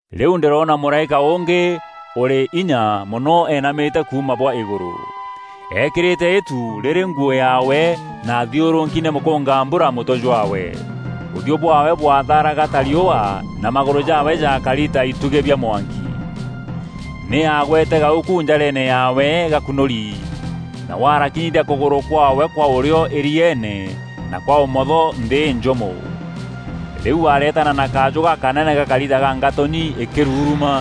Rîu ndîroona mûraîka ûngî ûrî inya mono eenamîte kuuma bwa îgûrû. Eekîrîte îtu rîrî nguû yaawe na aathiûrûki nî mûkûngambura mûtwe jwaawe. Ûthiû bwaawe bwathaaraga ta riûa na magûrû jaawe jaakari ta itugî bia mwanki. Nî aagwete gauku njareene yaawe gakunûri. Nawe arakinyithia kûgûrû kwaawe kwa ûrîo îrieene na kwa ûmotho nthî înjûmo. Rîu areetana na kajû gakanene gakari ta ka ngatûnyi îkûruruma.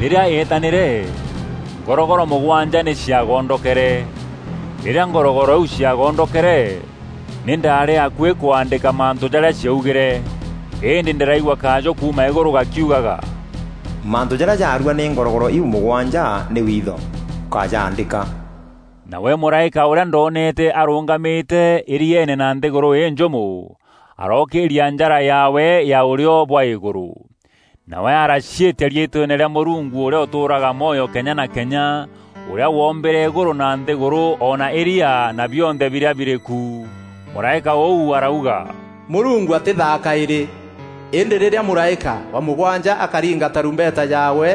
Rîrîa eetanîre, ngorogoro mûgwanja nî cia gondokere. Rîrîa ngorogoro iu cia gondokere, nî ndaarî akuî kwaandîka mantû jarîa ciaugîre. Îndî ndîraigua kajû kuuma îgûrû gakiugaga, “Mantû jarîa jaarua nî ngorogoro iu mûgwanja nî witho; ûkájaandîka!” Nawe mûraîka ûrîa ndoonete arûngamîte îrieene na nthîgûrû înjûmo, arookîîria njara yaawe ya ûrîo bwa îgûrû. Nawe araciîtia riîtweene rîa Mûrungu ûrîa ûtûûraga mwoyo kenya na kenya, ûrîa woombîre îgûrû na nthîgûrû o na îria na bionthe birîa birî ku. Mûraîka ûu arauga, “Mûrungu atîthaa kaîrî! Îndî rîrîa mûraîka wa mûgwanja akaringa tarumbeta yaawe,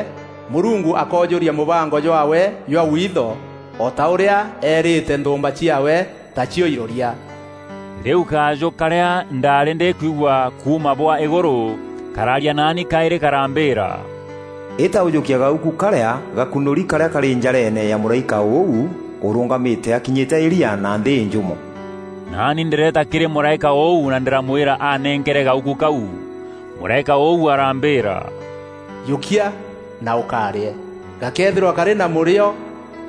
Mûrungu akoojûria mûbango jwaawe jwa witho o ta ûrîa eerîte nthûûmba ciaawe, tacio iroria.” Rîu kajû karîa ndaarî ndîkwigua kuuma bwa îgûrû karaaria naani kaîrî karambîîra, “Îta ûjûkie gauku karîa gakunûri karîa karî njareene ya mûraîka ûu ûrûngamîte akinyîte îria na nthî înjûmo.” Naani ndîreeta kîrî mûraîka ûu na ndîramwîra anenkere gauku kau. Mûraîka ûu arambîîra, “Jûkia na ûkarîe. Gakeethîrwa karî na mûrîo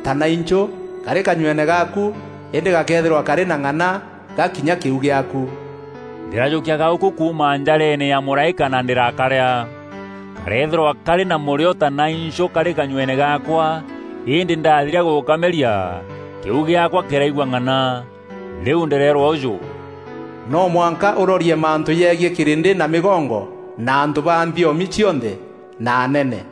ta nainchû karî kanyueene gaaku îndî gakeethîrwa karî na ng'ana gaakinya kîu gîaaku.” Ndîrajûkia gauku kuuma njareene ya mûraîka na ndîrakarîa. Kareethîrwa karî na mûrîo ta nainchû karî kanyueene gaakwa, îndî ndathiria gûkameria, kîu gîaakwa kîraigua ng'ana. Rîu ndîreerwa ûjû, “No mwanka ûrorie mantû jegiî kîrîndî na mîgongo na antû ba nthiomi cionthe na anene.”